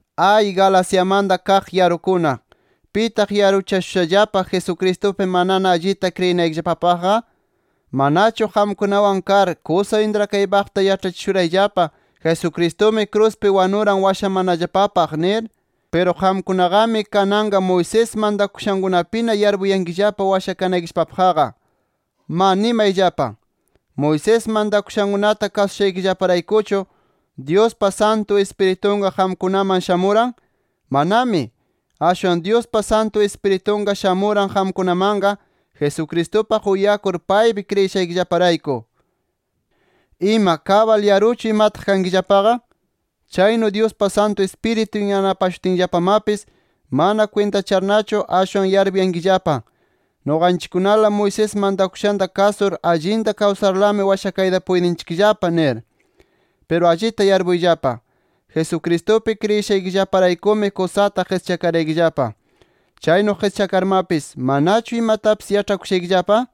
¡Ay, Galaciamanta kaq yarukuna! ¿Pitaq yaruchashushallapa, Jesucristupi manana allita kriyinaykillapapaqqa? ¿Manachu qamkunawan kar, kusa intrakaypaqta yaĉhachishurayllapa: “Jesucristumi kruspi wanuran washamanallapapaq” nir? Piru qamkunaqami kananqa Moisés mantakushankunapina yarpuyankillapa washakanaykillapapaqqa. ¡Ma, nimayllapa! ¿Moisés mantakushankunata kasushaykillaparaykuchu, Dyuspa Santu Ispiritunqa qamkunaman shamuran? ¡Manami! Ashwan Dyuspa Santu Ispiritunqa shamuran qamkunamanqa, Jesucristupaq uyakur, paypi kriyishaykillaparayku. ¿Ima, kabal yaruchu imataq kankillapaqa? ¿Chaynu Dyuspa Santu Ispiritun yanapashutinllapamapis, mana kwintachanarchu ashwan yarpuyankillapa, nuqanchikkunala Moisés mantakushanta kasur allinta kawsarlami washakayta puytinchikllapa? nir. Piru allita yarpuyllapa: Jesucristupi kriyishaykillaparaykumi kusata qischakaraykillapa. Chaynu qischakarmapis, ¿manachu imatapis yaĉhakushaykillapa?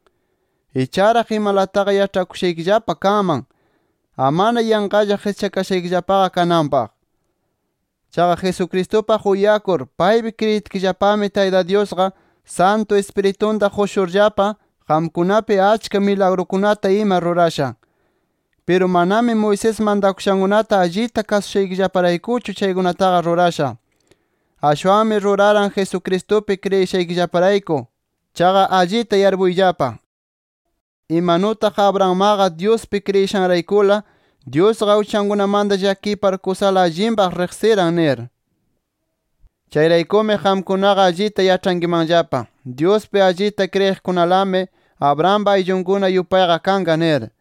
¡Icharaq imalataqa yaĉhakushaykillapa kanman, amana yanqalla qischakashaykillapaqa kananpaq! Chaqa Jesucristupaq uyakur, paypi kriyitkillapami, Tayta Dyusqa Santu Ispiritunta qushurllapa, qamkunapi achka milagrukunata ima rurasha. Piru manami Moisés mantakushankunata allita kasushaykillaparaykuchu chaykunataqa rurasha. Ashwanmi ruraran, Jesucristupi kriyishaykillaparayku. Chaqa allita yarpuyllapa: Imanutaq Abrahammaqa Dyuspi kriyishanraykula, Dyusqa uchankunamanta llakipar, kusala allinpaq riqsiran nir. Chayraykumi qamkunaqa allita yaĉhankimanllapa: Dyuspi allita kriyiqkunalami Abrahampa ayllunkuna yupayqa kanqa nir.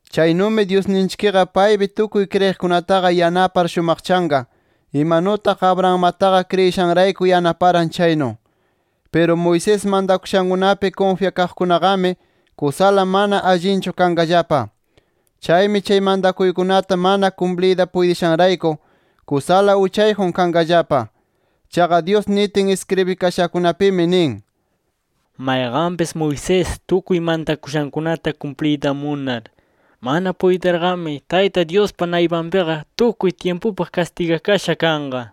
Chaynumi Dyusninchikqa paypi tukuy kriyiqkunataqa yanapar shumaqchanqa, imanutaq Abrahammataqa kriyishanrayku yanaparan chaynu. Piru Moisés mantakushankunapi kunfyakaqkunaqami, kusala mana allinchu kanqallapa. Chaymi chay mantakuykunata mana kumpliyta puytishanrayku, kusala uchayjun kanqallapa. Chaqa Dyus nitin iskribikashakunapimi nin: “Mayqanpis Moisés tukuy mantakushankunata kumpliyta munar, mana puytirqami Tayta Dyuspa naypanpiqa tukuy tyimpupaq kastigakasha kanqa” nir.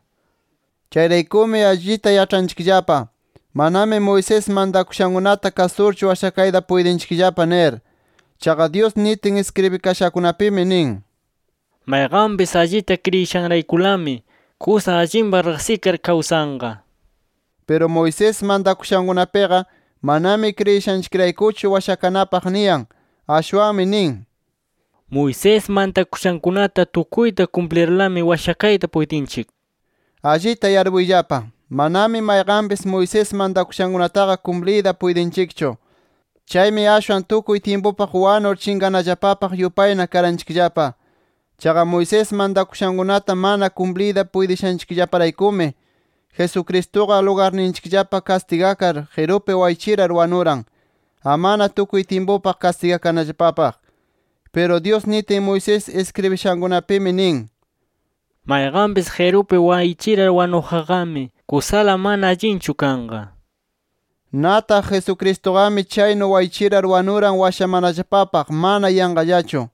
Chayraykumi allita yaĉhanchikllapa, manami Moisés mantakushankunata kasurchu washakayta puytinchikllapa nir. Chaqa Dyus nitin iskribikashakunapimi nin: “Mayqanpis allita kriyishanraykulami, kusa allinpaq riqsikar kawsanqa” nir. Piru Moisés mantakushankunapiqa, manami kriyishanchikraykuchu washakanapaq niyan. Ashwanmi nin: “Moisés mantakushankunata tukuyta kumplirlami washakayta puytinchik” nir. Allita yarpuyllapa: Manami mayqanpis, Moisés mantakushankunataqa kumpliyta puytinchikchu. Chaymi ashwan tukuy tyimpupaq wanur chinqanallapapaq yupayna karanchikllapa. Chaqa Moisés mantakushankunata mana kumpliyta puytishanchikllaparaykumi, Jesucristuqa lugarninchikllapa kastigakar qirupi waychirar wanuran, amana tukuy tyimpupaq kastigakanallapapaq. Piru Dyus nitin, Moisés iskribishankunapimi nin: “Mayqanpis qirupi waychirar wanuqqami, kusala mana allinchu kanqa” nir. Nataq Jesucristuqami chaynu waychirar wanuran washamanallapapaq, mana yanqallachu.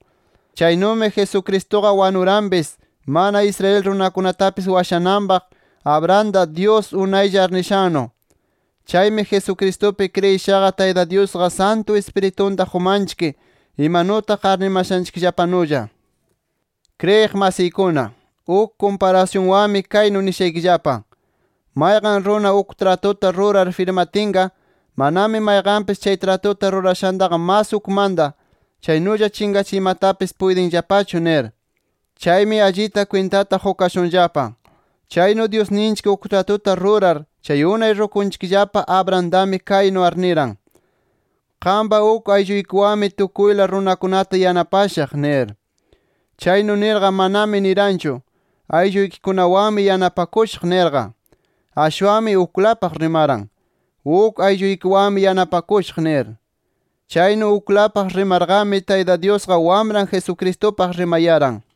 Chaynumi Jesucristuqa wanuranpis, mana Israel runakunatapis washananpaq Abrahamta, Dyus unaylla arnishannu. Chaymi Jesucristupi kriyishaqa, Tayta Dyusqa Santu Ispiritunta qumanchik imanutaq arnimashanchikllapanulla. Kriyiq masiykuna, uk kumparasyunwanmi kaynu nishaykillapa: “Mayqan runa uk tratuta rurar firmatinqa, manami mayqanpis chay tratuta rurashantaqa mas ukmanta, chaynulla chinqachiymatapis puytinllapachu” nir. Chaymi allita kwintata qukashunllapa, chaynu Dyusninchik uk tratuta rurar chay unay rukunchikllapa Abrahamtami, kaynu arniran: “Qampa uk aylluykiwanmi tukuyla runakunata yanapashaq” nir. Chaynu nirqa manami niranchu: “Aylluykikunawanmi yanapakushaq” nirqa. Ashwanmi uklapaq rimaran, “Uk aylluykiwanmi yanapakushaq” nir. Chaynu uklapaq rimarqami, Tayta Dyusqa Wamran Jesucristupaq rimayaran.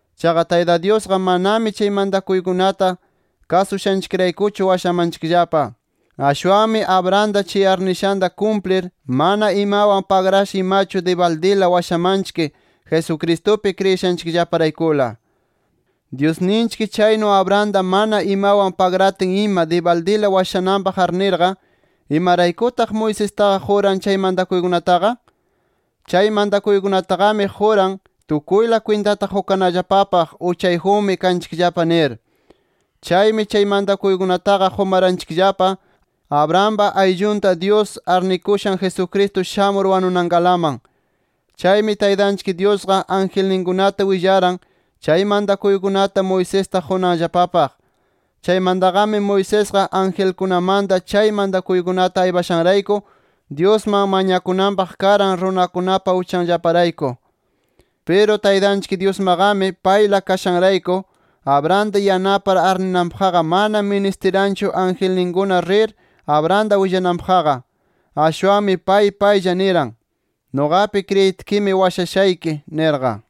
Chaqa Tayta Dyusqa manami chay mantakuykunata kasushanchikraykuchu washamanchikllapa. Ashwanmi Abrahamta chay arnishanta kumplir, mana imawan pagrasha imachu dibaldila washamanchik, Jesucristupi kriyishanchikllaparaykula. Dyusninchik chaynu Abrahamta mana imawan pagratin ima dibaldila washamananpaq arnirqa, ¿imaraykutaq Moisestaqa quran chay mantakuykunataqa? Chay mantakuykunataqami quran, tukuyla kwintata qukanallapapaq: Uchayjunmi kanchikllapa nir. Chaymi chay mantakuykunataqa qumaranchikllapa, Abrahampa ayllunta Dyus arnikushan Jesucristo shamur wanunankalaman. Chaymi Taytanchik Dyusqa, angelninkunata willaran, chay mantakuykunata Moisesta qunanllapapaq. Chaymantaqami Moisesqa, angelkunamanta chay mantakuykunata aypashanrayku, Dyusman mañakunanpaq karan runakunapa uchanllaparayku. Piru Taytanchik Dyusmaqami payla kashanrayku, Abrahamta yanapar arninanpaqqa mana ministiranchu angelninkuna rir Abrahamta willananpaqqa. Ashwanmi pay paylla niran: “Nuqapi kriyitkimi, washashayki” nirqa.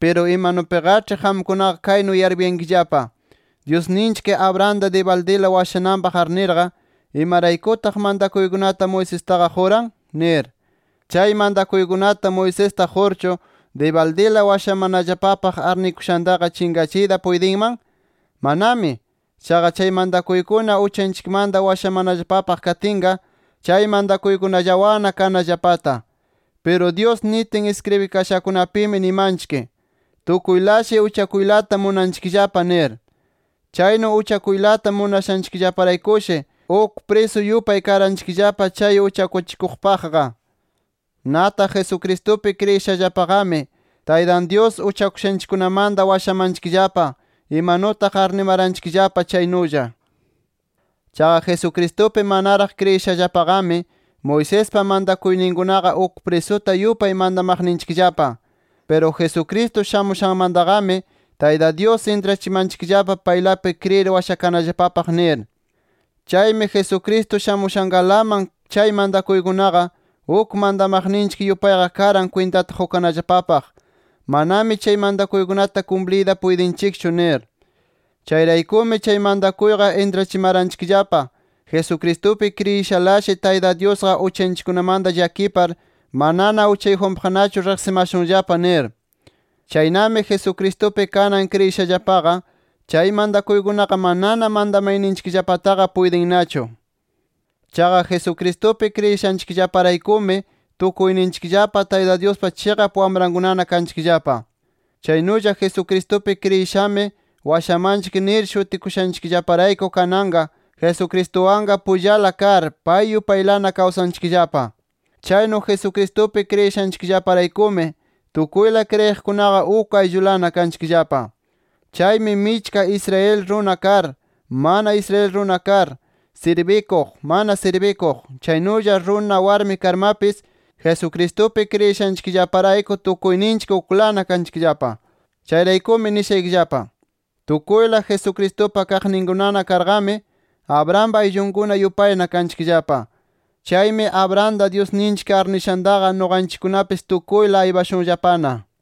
Piru imanupiqaĉhi qamkunaqa kaynu yarpuyankillapa: Dyusninchik, Abrahamta dibaldila washananpaq arnirqa, ¿imayraykutaq mantakuykunata Moisestaqa quran? nir. ¿Chay mantakuykunata Moisesta qurchu, dibaldila washamanallapapaq arnikushantaqa chinqachiyta puytinman? ¡Manami! Chaqa chay mantakuykuna uchanchikmanta washamanallapapaq katinqa, chay mantakuykunallawanna kanallapata. Piru Dyus nitin iskribikashakunapimi nimanchik: “Tukuylashi uchakuylata munanchikllapa” nir. Chaynu uchakuylata munashanchikllaparaykushi, uk prisu yupay karanchikllapa chay uchakuchikuqpaqqa. Nataq Jesucristupi kriyishallapaqami, Taytan Dyus uchakushanchikkunamanta washamanchikllapa, imanutaq arnimaranchikllapa chaynulla. Chaqa Jesucristupi manaraq kriyishallapaqami, Moisespa mantakuyninkunaqa uk prisuta yupay mantamaqninchikllapa. Piru Jesucristo shamushanmantaqami Tayta Dyus intrachimanchikllapa, paylapi kriyir washakanallapapaq, nir. Chaymi Jesucristo shamushankalaman chay mantakuykunaqa uk mantamaqninchik yupayqa karan kwintata qukanallapapaq, manami chay mantakuykunata kumpliyta puytinchikchu nir. Chayraykumi chay mantakuyqa intrachimaranchikllapa Jesucristupi kriyishalashi, Tayta Dyusqa uchanchikkunamanta llakipar, manana uchayjunpaqnachu riqsimashunllapa nir. Chaynami Jesucristupi kanan kriyishallapaqa, chay mantakuykunaqa manana mantamayninchikllapataqa puytinnachu. Chaqa Jesucristupi kriyishanchikllaparaykumi tukuyninchikllapa, Tayta Dyuspa chiqap wamrankunana kanchikllapa. Chaynulla Jesucristupi kriyishami washamanchik nir shutikushanchikllaparayku kananqa Jesucristuwanqa pullala kar, pay yupaylana kawsanchikllapa. Chaynu Jesucristupi kriyishanchikllaparaykumi tukuyla kriyiqkunaqa uk ayllulana kanchikllapa. Chaymi michka Israel runa kar, mana Israel runa kar, sirbikuq, mana sirbikuq, chaynulla runa, warmi karmapis Jesucristupi kriyishanchikllaparayku tukuyninchik uklana kanchikllapa. Chayraykumi nishaykillapa: Tukuyla Jesucristupa kaqninkunana karqami, Abrahampa ayllunkuna yupayna kanchikllapa. Chaymi Abrahamta Dyusninchik arnishantaqa nuqanchikkunapis tukuyla aypashunllapana.